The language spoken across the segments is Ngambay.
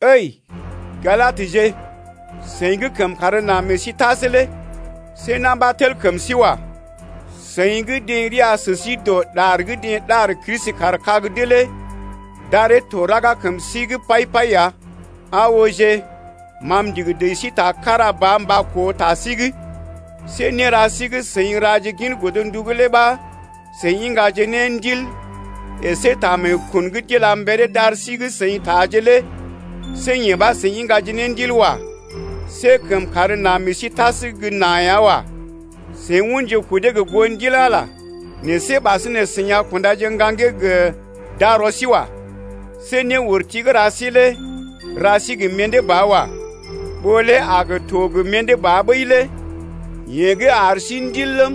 Ǝi Galadje, seḭ gə́ kəmkàr na meḛ sí tas lé see na̰ ɓa tel kəm sí wa. Seḭ gə́ deḛ ria sə sí dɔ ɗar gə́ deḛ ɗar Kristi kaar kag’d lé d’aree to raga kəm sí’g pai-pai ya. Aa ooje ma m’ndigi dəji sí ta kára ba mba koo ta sí’g. See néra sí gə́ seḭ raje gin godndu’g lé ɓa, seḭ iŋgaje ne Ndil əsé ta meekun gə́ d’ila mberee d’ar sí gə́ seḭ taaje lé see yee ɓa seḭ iŋgaje ne Ndil wa. See kəmkàr na meḛ sí tas gə́ na ya wa. Seḭ unje kudee gə goo Ndil Ala lé, nɛ see ɓasinè seḭ a kundaje ne ŋgaŋgee gə darɔ sí wa. See néurti gə́ ra sí lé ra sí gə mḭdé ba wa. Ɓó lé a gə to gə mḭdé ɓəi lé. Yeḛ gə́ ar sí Ndil ləm,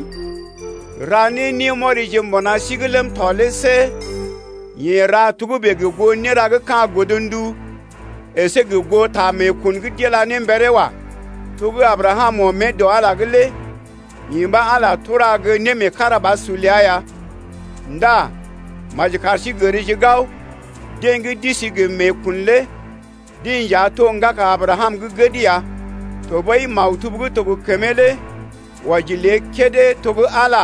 ra ne némɔrije mbuna sí’g ləm tɔ lé see yeḛ ra togə́bè gə goo néra gə́ ka̰ godndu əsé gə goo ta meekun gə́ d’ila ne mberee wa. To gə́ Abrakam ɔm mée dɔ Ala’g lé yee ɓa Ala tura ne gə́ némeekarabasur ləa ya ndá maji kar sí gərje gao deḛ gə́ d’isi gə meekun lé deḛ nja to ŋgaka Abrakam gə́ gəd ya. Tɔɓəi maktub gə́ to gə kəmee lé wɔji lée kédé oo to gə́ Ala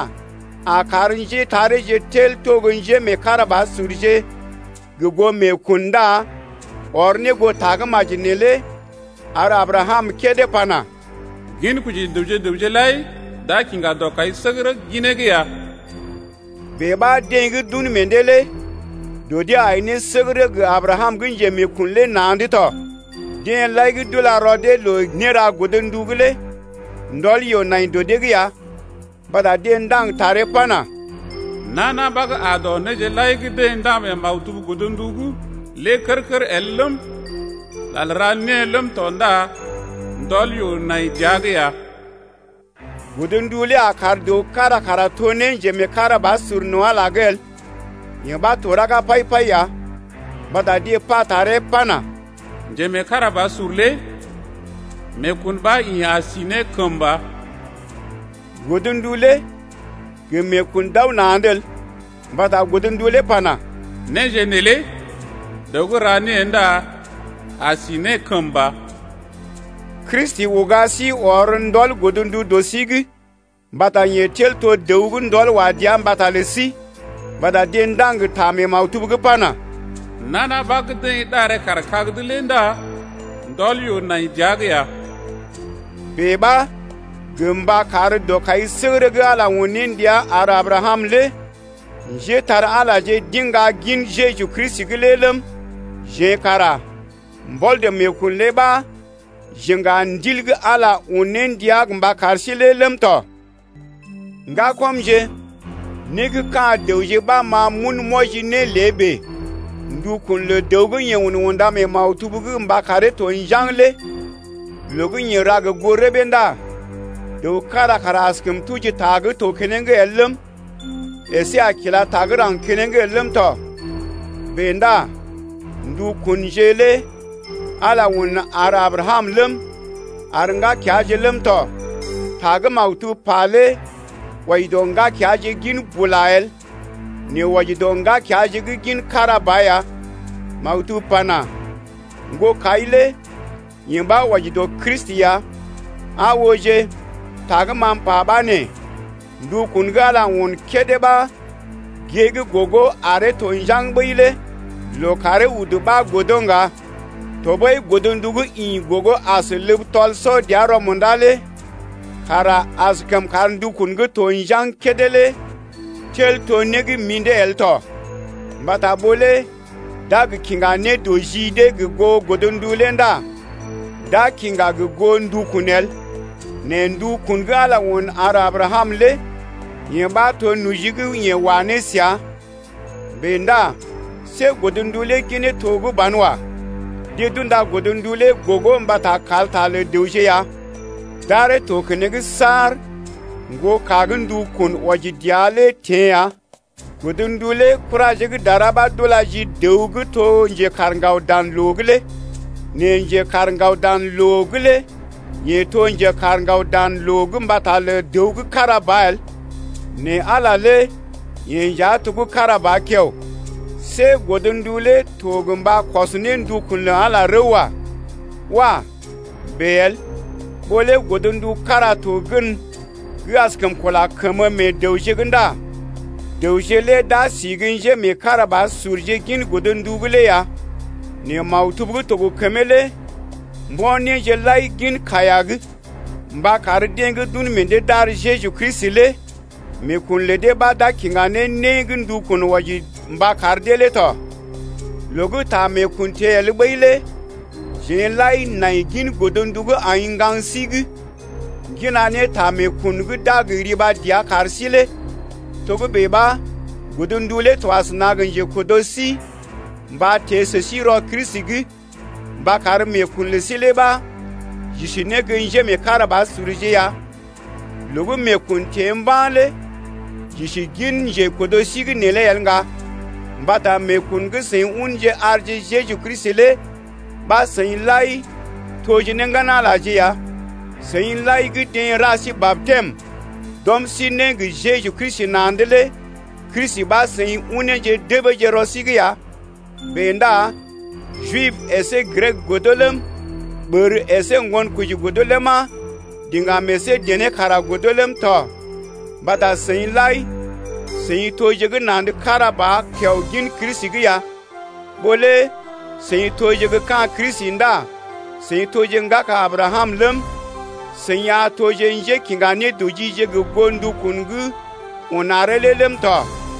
a gə kar njétareeje tel to gə́ njémeekarabasurje gə goo meekun ndá ɔr ne goo tagə́maji neelé ar Abrakam kédé pana: Ginkoji dəwje gə raŋg lai d’a kiŋga dɔkaisəgərə ginee’g ya. Bèe ɓa deḛ gə́ d’un meḛ dee lé dɔ dee ai səgərə gə Abrakam gə́ njemeekun lé na̰’d tɔ. Deḛ lai gə́ d’ula rɔ dee loo néra godndu’g lé ndɔl yoo nai dɔ dee’g ya, mbata deḛ ndaŋg taree pana: Nana ɓa gə́ aa dɔ néje lai gə́ deḛ ndaŋg mee maktub godndu’g lé kər-kər el ləm, lal ra née ləm tɔ ndá ndɔl yoo nai dəa’g ya. Godndu lé a kar dəw kára kara to ne njemeekarabasur no̰ Ala’g el, yee ɓa to raga pai-pai ya, mbata deḛ pa taree pana: Njemeekarabasur lé meekun ɓa yeḛ a si ne kəmba. Godndu lé gə meekun d’aw na̰’d el, mbata godndu lé pana: Néje neelé dəw gə́ ra née ndá a si ne kəmba. Kristi uga sí ɔr ndɔl godndu dɔ sí’g mbata yeḛ tel to dəw gə́ ndɔl wa dəa mbata lə sí, mbata deḛ ndaŋg ta mee maktub’g pana: Nana ɓa gə́ deḛ ɗaree kaar kag’d lé ndá ndɔl yoo nai dəa’g ya. Bèe ɓa gə mba kar dɔkaisəgərə gə́ Ala un ne ndia ar Abrakam lé njépole-magəje d’iŋga gin Jeju Kristi’g lé ləm, jeḛ kara mbɔl dɔ meekun lé ɓa j’iŋga ne Ndil gə́ Ala un ne ndia mba kar sí lé ləm tɔ. Ŋgakɔmje, (né gə́ ka̰ dəwje ɓa ma m’un m’wɔji ne lé bèe): ndukun lə dəw gə́ yeḛ unda mee maktub’g mba karee to njaŋg lé loo gə́ yeḛ ra gə goo rəbee ndá dəw kára kara askəm tuji ta gə́ to keneŋ el ləm, əsé a kila ta gə́ raŋg keneŋ el ləm tɔ. Bèe ndá ndukunje lé Ala un ar Abrakam ləm, ar ŋgakeaje ləm tɔ. Ta gə́ maktub pa lé wɔji dɔ ŋgakeaje gin bula el, nɛ wɔji dɔ ŋgakeaje gə́ gin kára ba ya. Maktub pana: Ŋgokai lé yee ɓa wɔji dɔ Kristi ya. Aa ooje, ta gə́ ma m’pa ɓa nee: Ndukun gə́ Ala un kédé ɓa gée gə́ gogo aree to njaŋg ɓəi lé loo karee udu ɓa godo ŋga. Tɔɓəi godndu gə́ ḭ gogo as ləb tɔl-sɔ-dəa-rɔ-munda lé kara askəm kar ndukun gə́ to njaŋg kédé lé tel to né gə́ mḭdé el tɔ. Mbata ɓó lé d’a gə kiŋga nédɔji dee gə goo godndu lé ndá d’a kiŋga gə goo ndukun el. Nɛ ndukun gə́ Ala un ar Abrakam lé yee ɓa to noji gə́ yeḛ wa ne səa ya. Bèe ndá see godndu lé ginee to gə́ banwa. Deḛ d’unda godndu lé gogo mbata kalta lə dəwje ya d’aree to keneŋ saar ŋgoka gə́ ndukun wɔji dəa lé teḛ lé ya. Godndu lé kuraje gə́ dara ɓa d’ula ji dəw gə́ to njekaar ŋgaw dan loo’g lé. Nɛ njekaar ŋgaw dan loo lé yeḛ to njekaar ŋgaw dan loo mbata lə dəw kára ba el nɛ Ala lé yeḛ nja to kára ba kiao ya. See godndu lé to gə mba kɔs ne ndukun lə Ala rəw wa. Wah! bèe el. Ɓó lé godndu kára to gən gə́ askəm kula kəmə meḛ dəwje’g ndá dəwje lé d’a si gə́ njémeekarabasurje gin godndu’g lé ya. Nɛ maktub gə́ to gə kəmee lé mbo̰ néje lai gin kaiya’g mba kar deḛ gə́ d’un meḛ dee d’ar Jeju Kristi lé meekun lə dee ɓa d’a kiŋga ne né gə́ ndukun wɔji mba kar dee lé tɔ. Loo gə́ ta meekun teḛ el ɓəi lé jeḛ lai nai gin godndu gə́ aḭ ŋgaŋ sí’g, ŋgina ne ta meekun gə́ d’a gə riba dəa kar sí lé. Togə́bè ɓa godndu lé to asəna gə njekɔrno̰ sí mba teḛ sə sí rɔ Kristi’g mba kar meekun lə sí lé ɓa j’isi ne gə́ njémeekarabasurje ya. Loo gə́ meekun teḛ mba̰ lé j’isi gin njekɔrno̰ sí’g neelé el ŋga. Mbata meekun gə́ seḭ unje arje Jeju Kristi lé ɓa seḭ lai toje ne ŋgan-Alaje ya. Seḭ lai gə́ deḛ ra sí batɛm d’ɔm sí ne gə Jeju Kristi na̰’d lé Kristi ɓa seḭ uneeje debeeje rɔ sí’g ya. Bèe ndá Jib əsé Grek godo ləm, ɓər əsé ŋgonkoji godo ləma, diŋgam əsé dené kara godo ləm tɔ, mbata seḭ lai seḭ toje gə́ na̰’d kára ba kiao gin Kristi’g ya. Ɓó lé seḭ toje gə́ ka̰ Kristi ndá seḭ toje ŋgaka Abrakam ləm, seḭ a toje njékiŋga nédɔjije gə goo ndukun gə́ un aree lé ləm tɔ.